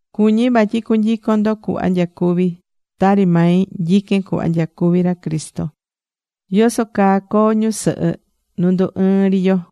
Cuñí vatyi cunyicon ndo cuhva nyacuví. Tari mai nyiquén cuhva nyacuví ra Cristo.Yoso caa coo ñusɨhɨ nu ndu ɨɨ́n ri yo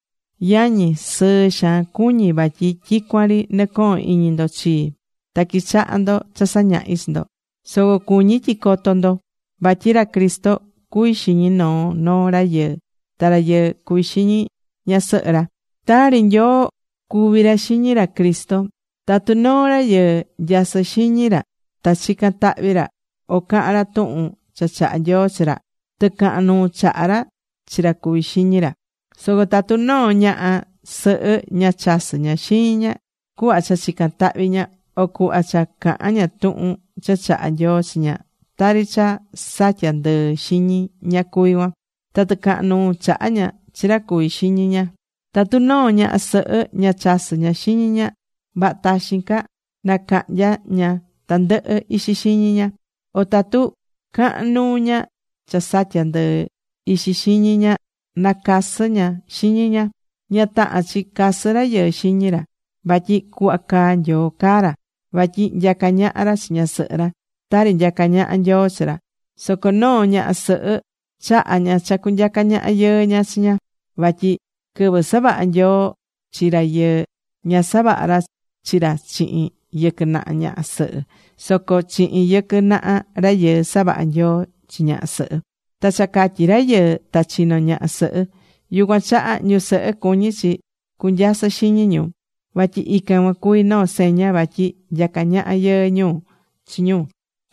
Yañi, sɨɨ xaan cuñí vatyi tyicuan ri nɨcohón iñi ndo chii. Ta quichahá ndo cha sañahí chi ndo. Soco cuñí tyi coto ndo vatyi ra Cristo cuví xiñi noo noo rayɨɨ, ta rayɨɨ cuví xiñi ñasɨhɨ ra, tari Nyoo cuví ra xiñi ra Cristo. Tatu noo rayɨɨ, nyasɨ́ xiñi ra ta chicán tahvi ra o cahán ra tuhun cha chahá Nyoo chi ra, tɨcahan nuu chahá ra chi ra cuví xiñi ra. Soco tatu noo ñaha sɨhɨ ña chasɨ́ ña xiñi ña cuhva cha chicán tahvi ña, o cuhva cha cahán ña tuhun cha chahá Nyoo chi ña, tari cha satya̱ ndɨɨ xiñi ña cuví cuan. Ta tɨcahan nuu chahá ña chi ra cuví xiñi ña. Tatu noo ñaha sɨhɨ ña chasɨ́ ña xiñi ña, vaha taxin ca nacahnya ña tandɨhɨ ixi xiñi ña. O tatu cahán nuu ña cha satyá ndɨɨ ixi xiñi ña, nacasɨ ña xiñi ña. Ña tahán chi casɨ rayɨɨ xiñi ra. Vatyi cuhva caá Nyoo caa ra, vatyi nyacá ñaha ra chi ñasɨhɨ ra, tari nyacá ñaha Nyoo chi ra. Soco noo ñaha sɨhɨ chahá ña cha cunyaca ñaha yɨɨ ña chi ña. Vatyi quɨvɨ savaha̱ Nyoo chi rayɨɨ, ña savaha̱ ra chi ra chihin yɨquɨ naha ñaha sɨhɨ. Soco chihin yɨquɨ naha rayɨɨ savaha̱ Nyoo chi ñaha sɨhɨ. Ta cha catyi rayɨɨ, ta chino̱ ñaha sɨhɨ. Yucuan chaha ñusɨhɨ cuñí chi cunyasɨ xiñi ñu. Vatyi ican cuan cuví noo seña vatyi nyacá ñaha yɨɨ ñu chi ñu.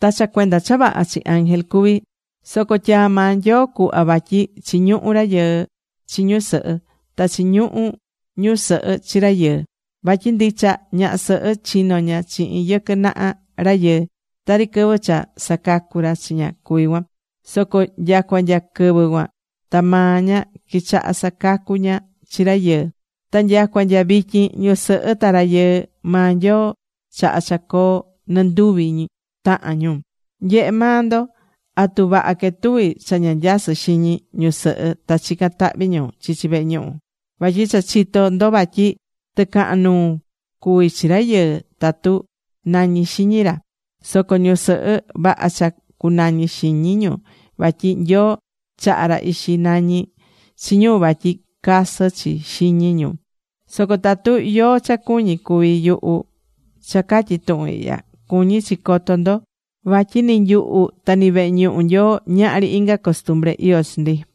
Ta cha cuenda cha vaha chi ángel cuví. Soco tyaa̱ maa Nyoo cuhva vatyi chiñuhú rayɨɨ chi ñusɨhɨ. Ta chiñuhú ñusɨhɨ chi rayɨɨ. Vatyi ndicha ñaha sɨhɨ chino̱ ña chihin yɨquɨ naha rayɨɨ, tari quɨvɨ cha sacacu̱ ra chi ña cuví cuan. Soco nya cua nya quɨvɨ cuan ta maa ña quichaha sacacu ña chi rayɨɨ. Ta nya cua nya vityin ñusɨhɨ ta rayɨɨ maa Nyoo chaha̱ cha coo nɨ nduvi tahan ñu. Nye̱he maa ndo. ¿Atu vaha quetuví cha ña nyasɨ́ xiñi ñusɨhɨ ta chicán tahvi ñu chichi vehe ñuhu? Vatyi cha chitó ndo vatyi tɨcahan nuu cuvi chi rayɨɨ tatu nañí xiñi ra. Soco ñusɨhɨ, vaha cha cunañí xiñi ñu vatyi Nyoo chahá ra ixi nañi chi ñu vatyi casɨ chi xiñi ñu. Soco tatu yóó cha cuñí cuví yuhu cha catyi tuhun ihya, cuñí chi coto ndo vatyi ni nyuhu ta ni vehe ñuhu Nyoo, ñahri inga costumbre iyó chi ndi.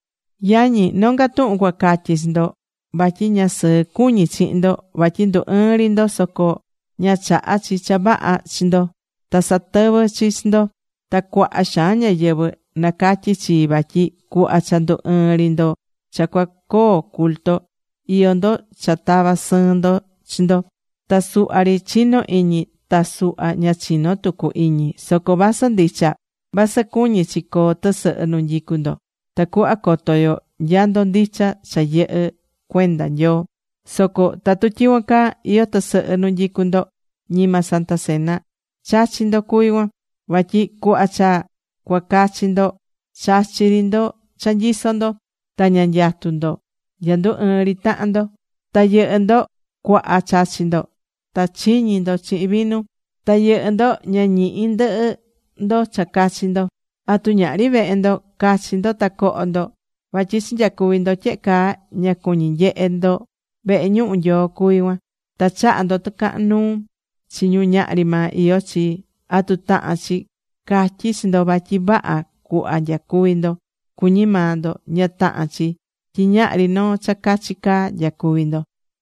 Yañi, nonga tuhun cuacatyi chi ndo. Vatyi ña sɨɨ cuñí chihin ndo, vatyi ndu ɨɨ́n ri ndo, soco ña chahá chi cha vaha chi ndo. Ta satɨvɨ́ chi chi ndo. Ta cuaha xaan ñáyɨvɨ nacatyí chii vatyi cuhva cha ndu ɨɨ́n ri ndo cha cuacoo culto, iyó ndo cha tavá sɨɨn ndo chi ndo. Ta suhva ri chinó iñi, ta suhva ña chinó tucu iñi. Soco vasɨ ndicha. Vasɨ cuñí chi coo tɨsɨhɨ nu nyicú ndo tacuhva coto yo nya ndo ndicha cha yɨhɨ́ cuenda Nyoo. Soco tatu tyicuan caa iyó tɨsɨhɨ nu nyicú ndo, ñima Santa Cena chachí ndo cuví cuan. Vatyi cuhva cha cuacachi ndo, chachí ri ndo cha nyisó ndo. Ta ña nyatú ndo nya ndu ɨɨ́n ri tahan ndo. Ta yɨhɨ́ ndo cuaha chachí ndo. Ta chiñí ndo chihin vinu. Ta yɨhɨ́ ndo ña ñihí ndɨhɨ ndo cha cachi ndo. ¿Atu ñahri vehe ndo cachi ndo ta coho ndo? Vatyi cha nyacuví ndo tyehe caa, ña cuñi nyehé ndo vehe ñuhu Nyoo cuví cuan. Ta chahá ndo tɨcahán nuu chi ñu ñahri maa iyó chi. ¿Atu tahán chi catyí chi ndo vatyi vaha cuhva nyacuví ndo, cuñi maa ndo? Ña tahán chi tyi ñahri noo cha cachi caa nyacuví ndo.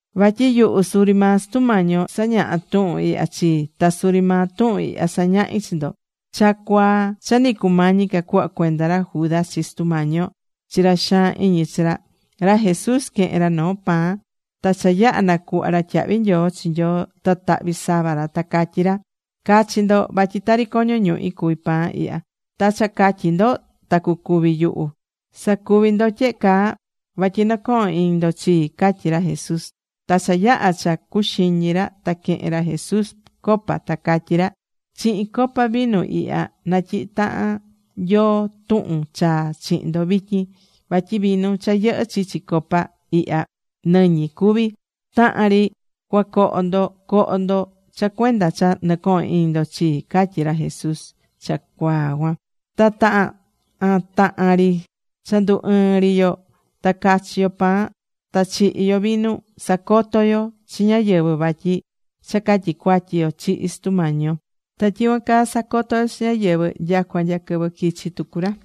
Vatyi yuhu suri maa Sutu Mañi yo sañaha tuhun ihya chii. Ta suri maa tuhun ihya sañahi chi ndo. Cha cuaa cha nɨ cumañi ca cuhva cuenda ra Judas chi Sutu Mañi yo chi ra xaan iñí chi ra, ra Jesús quehe̱n ra noo pan. Ta cha yaha̱ nacuhva̱ ra tyahvi nyoo chi Nyoo ta tahvi̱ sava ra. Ta catyí ra: “Ca̱chi ndo. Vatyi tari coño ñuhi cuví pan ihya. Ta cha catyi ndo ta cucúvi yuhu. Sa̱cuvi ndo tyehe caa vatyi nɨcohon iñi ndo chii”, catyí ra Jesús. Ta cha yaha̱ cha cacuxiñi ra ta quehe̱n ra Jesús copa ta catyi̱ ra: “Chihin copa vinu ihya natyihí tahan Nyoo tuhun chaa chihin ndo vityin. Vatyi vinu cha yɨhɨ́ chichi copa ihya, nɨñi cuvi. Tahan ri cuacoho ndo, co̱ho ndo cha cuenda cha nɨcohón iñi ndo chii”, catyi̱ ra Jesús cha cuaa cuan. Ta tahan ri cha ndu ɨɨ́n ri yo ta chachí yo pan ta chihí yo vinu sacotó yo chi ñáyɨvɨ vatyi cha catyi cuatyi yo chihi̱ Sutu Mañi yo. Ta tyicuan caa sacotó yo chi ñáyɨvɨ nyacua nya quɨvɨ quichi tucu ra.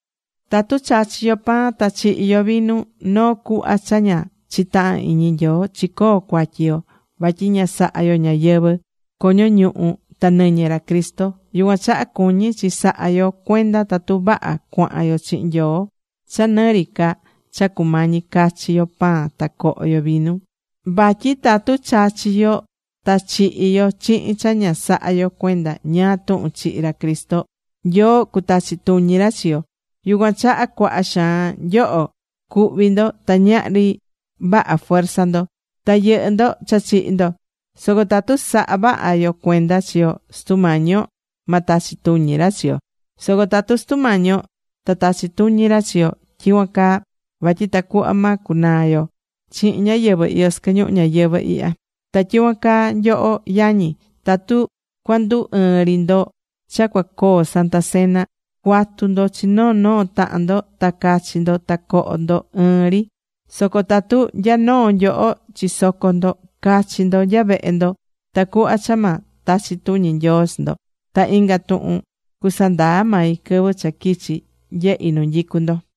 Tatu chachí yo pan ta chihí yo vinu noo cuhvá cha ña chitahán iñi Nyoo, chicoó cuatyi yo. Vatyi ña sahá yo ñáyɨvɨ coño ñuhu ta nɨñɨ ra Cristo. Yucuan chaha cuñí chi sahá yo cuenda tatu vaha cuahán yo chihin Nyoo cha nɨ ri ca cha cumañi cachi yo pan ta coho yo vinu. Vatyi tatu chachí yo ta chihí yo chihin cha ña sahá yo cuenda ñáá tuhun chihi ra Cristo, Nyoo cutachi tuñi ra chi yo. Yucuan chaha cuaha xaan nyoho cuhví ndo, ta ñahri vaha fuerza ndo. Ta yɨhɨ́ ndo cha chihi̱ ndo. Soco tatu sahá vaha yo cuenda chi yo, Sutu Mañi yo ma tachi tuñi ra chi yo. Soco tatu Sutu Mañi yo ta tachi tuñi ra chi yo tyicuan caa, vatyi tacuhva ma cunaa yo chihin ñáyɨvɨ iyó sɨquɨ ñuhu ñayɨvɨ̱ ihya. Ta tyicuan caa nyoho yañi, tatu cuandu ɨɨn ri ndo cha cuacoo Santa Cena, cua̱tu ndo chi noo noo tahan ndo ta ca̱chi ndo ta co̱ho ndo ɨɨn ri. Soco tatu nya noo nyoho chisocó ndo, cachi ndo nya vehe ndo tacuhva cha ma tachi tuñi Nyoo chi ndo. Ta inga tuhun cusandaa mai quɨvɨ cha quichi nyehi nu nyicu ndo.